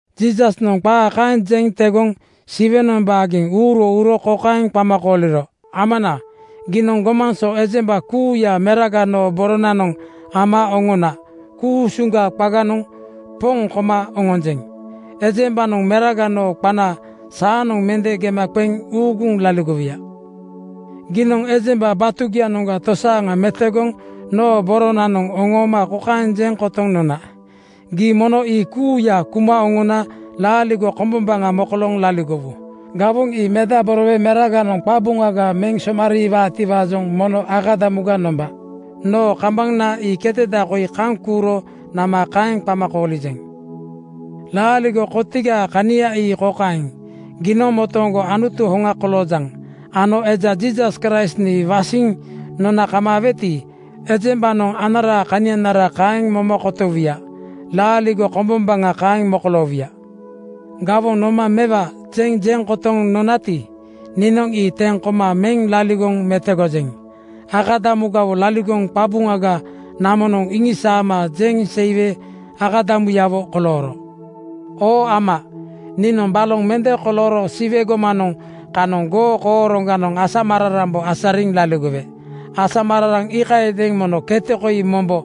Jiisasnoŋ qaa kaeŋ jeŋ tegoŋ Siwenoŋ baageŋ uuro uro kokaeŋ qama kooliro, “Amana, giinoŋ gomaŋ so ejemba kuuya Meraga noo baananoŋ ama oŋona ku-usuŋ qaganoŋ Poŋ koma oŋonjeŋ. Ejembanoŋ Meraga noo qaana saanoŋ mende gema qeŋ uuguŋ laligowuya. Giinoŋ ejemba batugianoŋga tosaaŋa metogoŋ noo boronanoŋ oŋooma kokaeŋ jeŋ kotoŋ nona, ‘Gii mono ii kuuya kuma oŋona laaligo kombombaŋa mokolooŋ laligowu.’ Gawoŋ ii medaborowe Meraganoŋ qabuŋaga meŋ somariiwaati-waajoŋ mono akadamuga nomba. Noo kambana ii keteda koi kaŋ kuuro nama kaeŋ qama koolijeŋ. “Laaligo kotigaa kania ii kokaeŋ: Giinoŋ motooŋgo Anutu hoŋa koloojaŋ ano eja Jiisas Kraist nii wasiŋ nona kamaaweti, ejembanoŋ anaraa kanianara kaeŋ moma kotowuya. Laaligo kombombaŋa kaeŋ mokoloowuya. Gawoŋ noma ‘Mewa,’ jeŋ jeŋ kotoŋ nonati, niinoŋ ii teŋ koma meŋ laligoŋ metogojeŋ. Akadamugawo laligoŋ qabuŋaga namonoŋ iŋisaama jeŋ seiwe akadamuyawo kolooro. “Oo Ama, niinoŋ baloŋ mende kolooro Siwe gomanoŋ kanoŋ goo kooroŋganoŋ asamararambo asariŋ laligowe. Asamararaŋ iikayadeeŋ mono kete koi mombo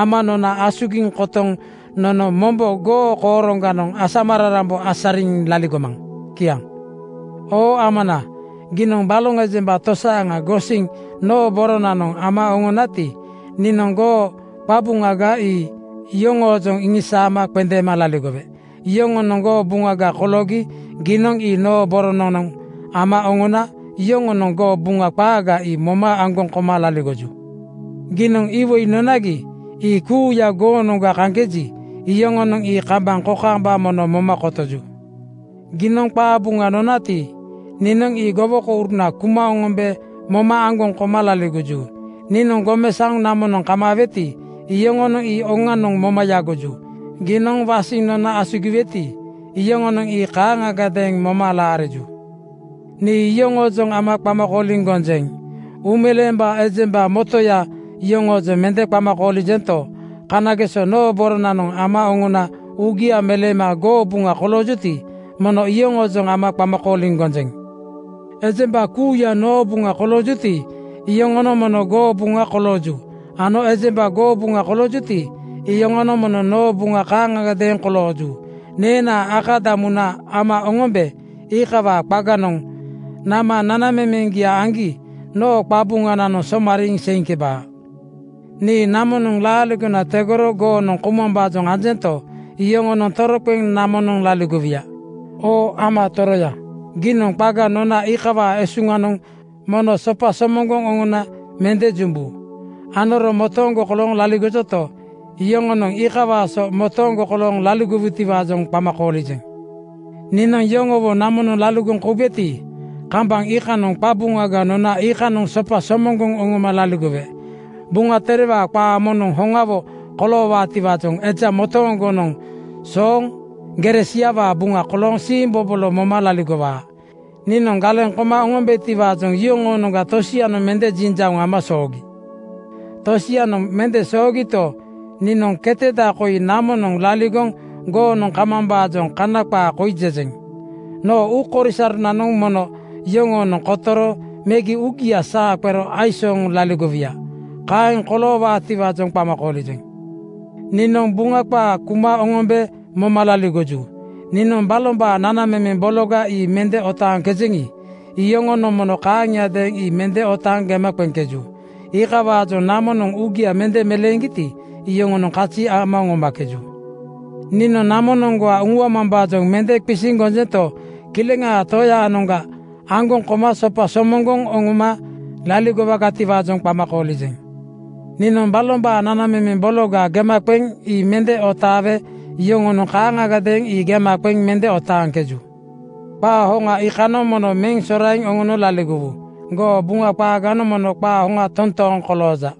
ama nona asugiŋ kotoŋ nono mombo goo kooroŋganoŋ asamararambo asariŋ laligomaŋ.” Kiaŋ. “Oo Amana, giinoŋ baloŋ ejemba tosaaŋa gosiŋ noo boronanoŋ ama oŋonati, niinoŋ goo qabuŋaga ii yoŋoojoŋ iŋisaama qendeema laligowe. Yoŋonoŋ goo buŋaga koloogi giinoŋ ii noo boronanoŋ ama oŋona yoŋonoŋ goo Buŋa qaaga ii moma aŋgoŋ koma laligoju. Giinoŋ iwoi nonagi, ii kuuya goonoŋga kaŋkeji, iyoŋonoŋ ii kambaŋ kokaamba mono moma kotoju. Giinoŋ qaa Buŋa nonati, niinoŋ ii gowokouruna kuma oŋombe moma aŋgoŋ koma laligoju. Nii gomesaoŋ namonoŋ kamaaweti, iyoŋonoŋ ii oŋanoŋ moma yagoju. Giinoŋ wasiŋ nona asugiweti, iyoŋonoŋ ii kaaŋagadeeŋ moma laariju. “Nii yoŋoojoŋ ama qama kooliŋ gonjeŋ. Uumeleembaa ejemba motoya yoŋoojoŋ mende qama koolijento, kanageso noo boronanoŋ ama oŋona uugia meleema goo buŋa koloojuti, mono iyoŋoojoŋ ama qama kooliŋ gonjeŋ. Ejemba kuuya noo buŋa koloojuti, iyoŋonoŋ mono goo buŋa kolooju ano ejemba goo buŋa koloojuti, iyoŋonoŋ mono noo buŋa kaaŋagadeeŋ kolooju. Neenaa akadamuna ama oŋombe iikawaa qaganoŋ nama nanamemeŋgia aŋgi noo qabuŋananoŋ somariiŋ seiŋkebaa. Nii namonoŋ laaligona tegoro goonoŋ koumambaajoŋ anjento, iyoŋonoŋ toroqeŋ namonoŋ laligowuya. Oo Ama Toroya, giinoŋ qaga nona iikawaa esuŋanoŋ mono sopa somoŋgoŋ oŋona mende jumbu. Anoro motooŋgo kolooŋ laligojoti, iyoŋonoŋ iikawaa so motooŋgo kolooŋ laligowu-tiwaajoŋ qama koolijeŋ. “Niinoŋ yoŋowo namonoŋ laligoŋ koubeti, kambaŋ iikanoŋ qabuŋaga nona iikanoŋ sopa somoŋgoŋ oŋoma laligowe. Buŋa Terewaa qaa moŋnoŋ hoŋawo koloowaatiwaajoŋ eja motooŋgonoŋ sooŋ gere siawaa buŋa kolooŋ siimbobolo moma laligowaa. Niinoŋ galeŋ koma oŋombetiwaajoŋ yoŋoonoŋga tosianoŋ mende jiŋjauŋ ama soogi. Tosianoŋ mende soogito, niinoŋ keteda koi namonoŋ laligoŋ goonoŋ kamambaajoŋ kaŋ qaa koi jejeŋ: Noo uukori-soronanoŋ mono yoŋoonoŋ kotoro megi uugia saa qero aisooŋ laligowuya. Kaeŋ koloowaatiwaajoŋ qama koolijeŋ. Niinoŋ goo Buŋa qaa kuma oŋombe moma laligoju. Niinoŋ balombaa nanamemeŋ bologa ii mende otaaŋkejeŋi, iyoŋonoŋ mono kaaŋagadeeŋ ii mende otaaŋ gema qeŋkeju. Iikawaajoŋ namonoŋ uugia mende meleeŋgiti, yoŋonoŋ kazi ama oŋomakeju. “Niinoŋ namonoŋga uŋuamambaajoŋ mende qisiŋ gonjento, Kileŋaa Toyaanoŋga aŋgoŋ koma sopa somoŋgoŋ oŋoma laligo-wagatiwaajoŋ qama koolijeŋ. Niinoŋ balombaa nanamemeŋ bologa gema qeŋ ii mende otaawe yoŋonoŋ kaaŋagadeeŋ ii gema qeŋ mende otaaŋkeju. Qaa hoŋa iikanoŋ mono meŋ soraiŋ oŋono laligowu. Goo Buŋa qaaganoŋ mono qaa hoŋa toontooŋ kolooja.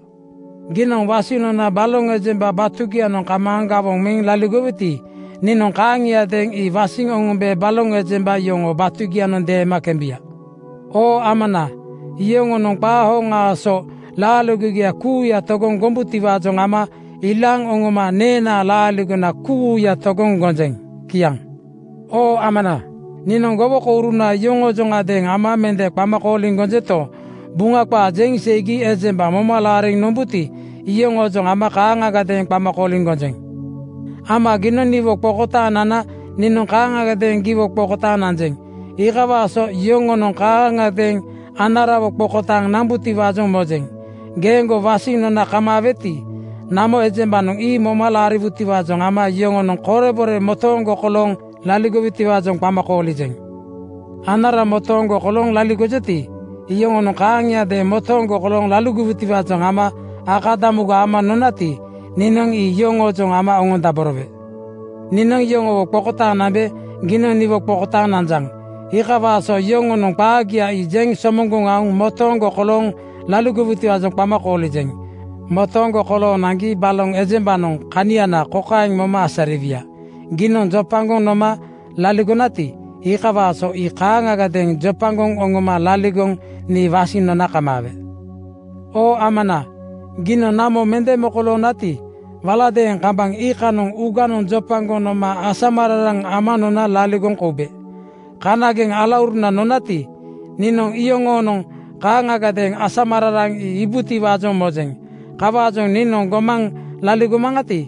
Giinoŋ wasiŋ nona baloŋ ejemba batugianoŋ kamaaŋ gawoŋ meŋ laligoweti, niinoŋ kaaŋiadeeŋ ii wasiŋ oŋombe baloŋ ejemba yoŋoo batugianoŋ deema kembuya. Oo Amana, iyoŋonoŋ qaa hoŋaa so laaligogia kuuya togoŋ gombutiwaajoŋ ama ilaaŋ oŋoma neenaa laaligona kuuya togoŋ gonjeŋ.” Kiaŋ. “Oo Amana, niinoŋ gowokouruna yoŋoojoŋadeeŋ ama mende qama koolijento, Buŋa qaa jeŋ seigi ejemba moma laariŋ nombuti, iyoŋoojoŋ ama kaaŋagadeeŋ qama koolijeŋ. Ama giinoŋ niwo qokotaaŋ nana niinoŋ kaaŋagadeeŋ giwo qokotaaŋ nanjeŋ. Iikawaa so yoŋonoŋ kaaŋagadeeŋ anarawo qokotaaŋ nambutiwaajoŋ mojeŋ. Geeŋgo wasiŋ nona kamaaweti, namo ejembanoŋ ii moma laariwutiwaajoŋ ama yoŋonoŋ korebore motooŋgo kolooŋ laligowutiwaajoŋ qama koolijeŋ. Anara motooŋgo kolooŋ laligojoti, iyoŋonoŋ kaaŋiadeeŋ motooŋgo kolooŋ laligowutiwaajoŋ ama akadamuga ama nonati, niinoŋ ii iyoŋoojoŋ ama oŋondaborowe. “Niinoŋ iyoŋowo qokotaaŋ nambe giinoŋ niwo qokotaaŋ nanjaŋ. Iikawaa so yoŋonoŋ qaagia jeŋ somoŋgoŋ aoŋ motooŋgo kolooŋ laligowutiwaajoŋ qama koolijeŋ. Motooŋgo kolooŋ naŋgi baloŋ ejembanoŋ kaniana kokaeŋ moma asariwuya: Giinoŋ jopagoŋ noma laligonati, iikawaa so ii kaaŋagadeeŋ jopagoŋ oŋoma laligoŋ nii wasiŋ nona kamaawe. “Oo Amana, giinoŋ namo mende mokoloonati, waladeeŋ kambaŋ iikanoŋ uuganoŋ jopagoŋ noma asamararaŋ ama nona laligoŋ koube. Kanageŋ alauruna nonati, niinoŋ iyoŋonoŋ kaaŋagadeeŋ asamararaŋ ii iibutiwaajoŋ mojeŋ. Kawaajoŋ niinoŋ gomaŋ laligo-maŋati,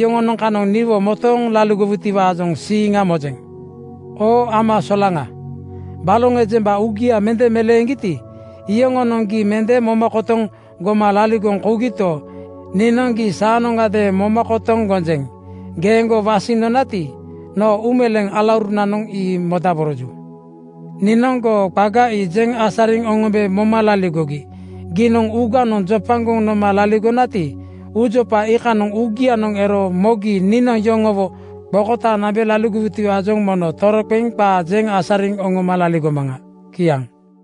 yoŋonoŋ kanoŋ niwo motooŋ laligowutiwaajoŋ siiŋa mojeŋ. “Oo Ama solaŋa, baloŋ ejemba uugia mende meleeŋgiti, yoŋonoŋ gii mende moma kotoŋ goma laligoŋ kougito, niinoŋ gii saanoŋgadeeŋ moma kotoŋ gonjeŋ. Geeŋgo wasiŋ nonati, noo uumeleeŋ alaurunanoŋ ii modaboroju. Niinoŋ goo qaga ii jeŋ asariŋ oŋombe moma laligogi. Giinoŋ uuganoŋ jopagoŋ noma laligonati, uujopa iikanoŋ uugianoŋ ero mogi niinoŋ yoŋowo qokotaaŋ nambe laligowutiwaajoŋ mono toroqeŋ qaga jeŋ asariŋ oŋoma laligomaŋa.” Kiaŋ.